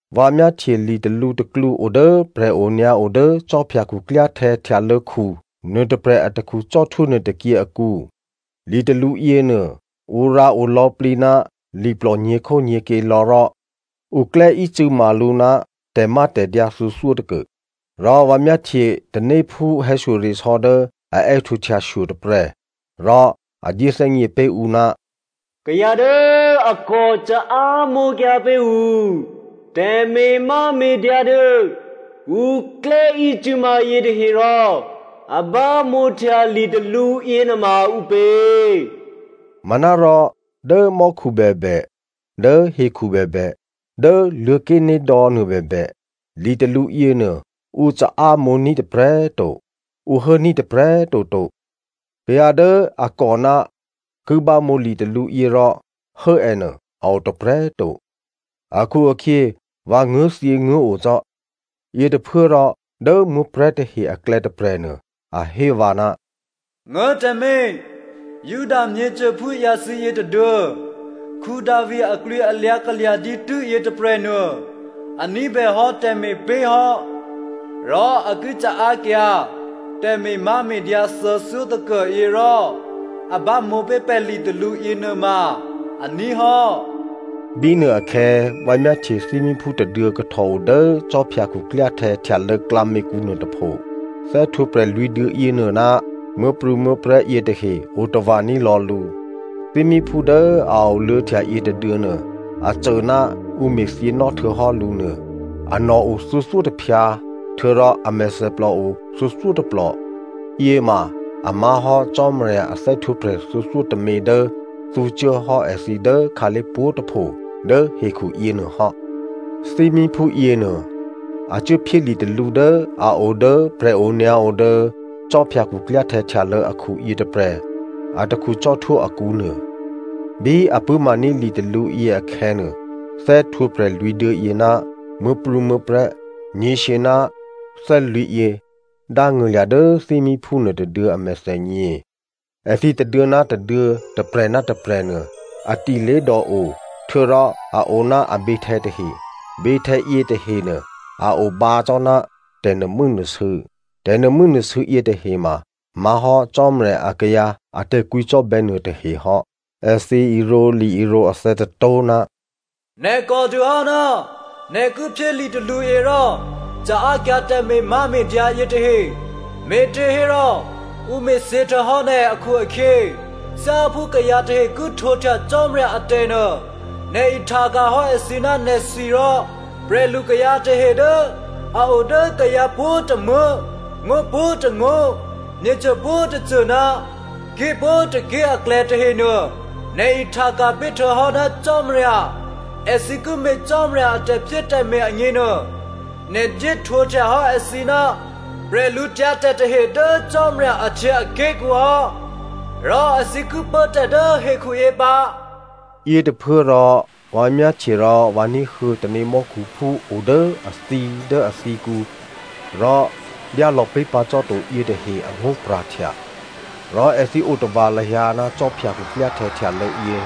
Vǎ myáhtye li talǔ tôklǔ o dố prè̤onyǎo dố khwí khuklyáhtè̌ htyalô̌khu nuôtôprè̤ atakhu cò́htwó nuôtôkyě akǔ. Litalǔ yěnuô, ǔ rǎo lò̌plǐ ná liplò nyě̤khónyě̤kyě lò̌ rò ǔ klè́ícû̌ma lǔ ná tè̤mátè̤dyǎ thuô̌thyótôkuô. Rò vǎ myáhtye tanéphú hè̌shyoresò̌ dố a è́htǒhtyashyo tôprè̤ rò a dyéthè́gně pé̤ ǔ, “Kayǎ dố a kò caámǒkyǎ pé̤ ǔ tè̤me̤máme̤dyǎ dố ǔ klè́ícû̌ma yětahe rò a bámǒhtya litalǔ yěnuôma ǔpě?” Manárò dố mò́khu bèbè, dố hekhu bèbè, dố Luô̤̌ké̤nédò̌ nuô bèbè, litalǔ yěnuô, ǔ caámǒní̤ tôprè̤꤮ to, ǔ hốní̤ tôprè̤꤮ toto. Kayǎ dố a kòná ki bámǒ litalǔyě rò hố ènuô a o tôprè̤꤮ to akhu-akhyě, vǎ nguố̤thyěnguố̤o cò́. Yětôphuốrò dố muố̤prè̤́ tahe aklè̌ tôprè̤nuô, a hé vǎ, “Nguố̤ tǎmé̤, Juda myěcôphú ǎyǎthǐ yětôduô̌, Davi aklwǐlyǎ kalya̤ dǐtû́ yětôprè̤nuô, a ní̤bèhò́ tè̤me̤pé̤ hò́, rò a ki caákyǎ tè̤me̤máme̤dyǎ thuô̌thyótôkuô yě rò a bámǒ pé̤ pè̤ litalǔ yěnuôma aní̤ hò́.” Bínuôakhè̌ vǎ myáhtye thímíphú tôduô̌ kahtò odố khwí khuklyáhtè̌ htyalô̌ klǎměkǔ nuôtôpho. Thè́htwǒprè̤ lwǐ̤duô̌ yěnuô ná muố̤prû̌muố̤prè̤́ yětahe otava̤ ní̤lò̌ lǔ. Thímíphú dố a oluô̌htya yětôduô̌nuô a cô ná ǔ me̤thyěnò́ htuô̌hò́ lǔ nuô. Anò̤ o thuô̌thyótôphyǎ, htuô̌rò a mèthèplò o thuô̌thyótôplò, yěma a má̤hò́ Cò́marya a thè́htwǒprè̤ thuô̌thyótômě dố thǔcuố hò́ èthǐ dố khǎlé̤ pwǒ̤꤮ tôpho dố hekhu yěnuôhò́. Thímíphú yěnuô, a cuốphyé litalǔ dố a o dố prè̤onyǎo dố khwí khuklyáhtè̌ htyalô̌ akhu yětôprè̤ atakhu cò́htwó akǔnuô. Bí a pṳ̂́maní̤ litalǔyě akhè̌nuô, thè́htwǒprè̤ lwǐ̤duô̌yě ná muố̤prû̌muố̤prè̤́ nyě̤shyě ná thè́lwǐ̤ yě dángṳ̂lya̤ dố thímíphú nuôtôduô̌ a mèthènyě. Èthǐ tôduô̌ ná tôduô̌, tôprè̤ ná tôprè̤ nuô, a ti lé̤dò o htuô̌rò a o ná aběhtè̌ tahe. Běhtè̌ yětahenuô a o bǎ cò́ ná tè̤nuô̤mû́nuô̤sû̌. Tè̤nuô̤mû́nuô̤sû̌ yětahe ma má̤hò́ Cò́marya akayǎ a tè̤kwǐcò́bè̌ nuôtahe hò́. Èthǐ irǒ li-irǒ athè̌ tôtó̤, “Nè̤ kòdûhò́ ná nè̤ ki phyé litalǔyě rò caákyǎ tè̤me̤máme̤dyǎ yětahe. Me̤těhérò ǔ me̤thyě htuô̌hò́ nè̤ akhu-akhyě, thyáphú kayǎ tahe ki htwǒhtya Cò́marya atè̤ nuô nè̤ ihtaka̤hò́ èthǐ ná nè̤thwi rò prè̤lukayǎ tahehe dố a o dố kayǎ pwǒ̤tômuố̤, ngó̤ pwǒ̤tôngó̤, myěcô pwǒ̤꤮ tôcô ná ké̤ pwǒ̤tôké̤ aklè̌ tahenuô, nè̤ ihtaka̤ pé̤ htuô̌hò́ ná Cò́marya. Èthǐ ki me̤ Cò́marya a tè̤phyétè̤me̤ agněnuô, nè̤ dyéhtwǒhtya hò́ èthǐ ná bwídu tahe dố Cò́marya ahtyěaké̤kǔ hò́. Rò èthǐ ki pốtè̤ dố hekhuyě pǎ.” Yětôphuốrò, vǎ myáhtye rò vǎ ní̤huô̌ tanémò́khuphú o dố athǐ dố athǐkǔ rò dyálò̌pé̤ pǎ cò́to yětahe angó̤pra̤htya. Rò èthǐ otava̤ lahyǎ ná khwí khuklyáhtè̌ htyalô̌ yě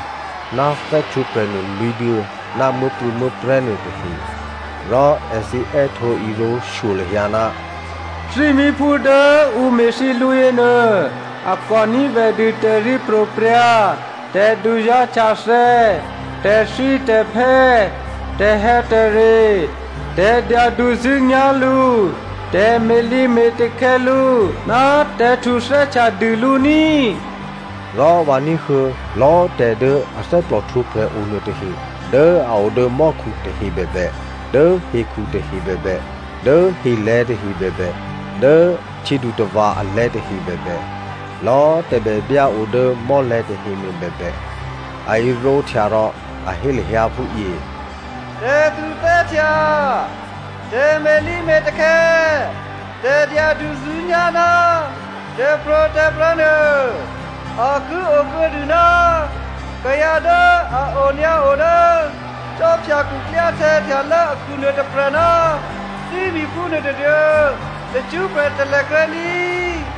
ná thè́htwǒprè̤nuô lwǐ̤duô̌ ná muố̤prû̌muố̤prè̤́ nuôtahe. Rò èthǐ è́htǒ irǒ shyo lahyǎ, “Thímíphú dố ǔ me̤thyě lǔ yěnuô, a kò ní̤bèdû taryěpro̤prya̤, tè̤duzá̤htyathè̌, tè̤thítè̤phè́, tè̤hè̌tè̤re, tè̤dyaduzṳ̂́nyá̤ lǔ, tè̤me̤lǐme̤takhè̌ lǔ, ná tè̤htuthè́htya dû lǔ ní꤮.” Rò vǎ ní̤huô̌ lò̌꤮ tè̤ dố athè́plò htwǒprè̤ o nuôtahe dố a o dố mò́khu tahe bèbè, dố hekhu tahe bèbè, dố helè̤̌ tahe bèbè, dố htyědutava̤ alè̤̌ tahe bèbè, lò̌꤮ tè̤bèbyá o dố mò́lè̤̌ tahenuô bèbè, a irǒhtya rò a hé lahyǎ phúyě, “Tè̤htuthè́htya, tè̤me̤lǐme̤takhè̌, tè̤dyaduzṳ̂́nyá̤ ná tè̤pro̤tè̤prya̤ nuô a ki o kuô̌dû ná kayǎ dố a onyǎo dố khwí khuklyáhtè̌ htyalô̌ akhu nuôtôprè̤ ná thímíphú nuôtôduô̌ tacṳ́prè̤ talèkrè́ ní꤮.”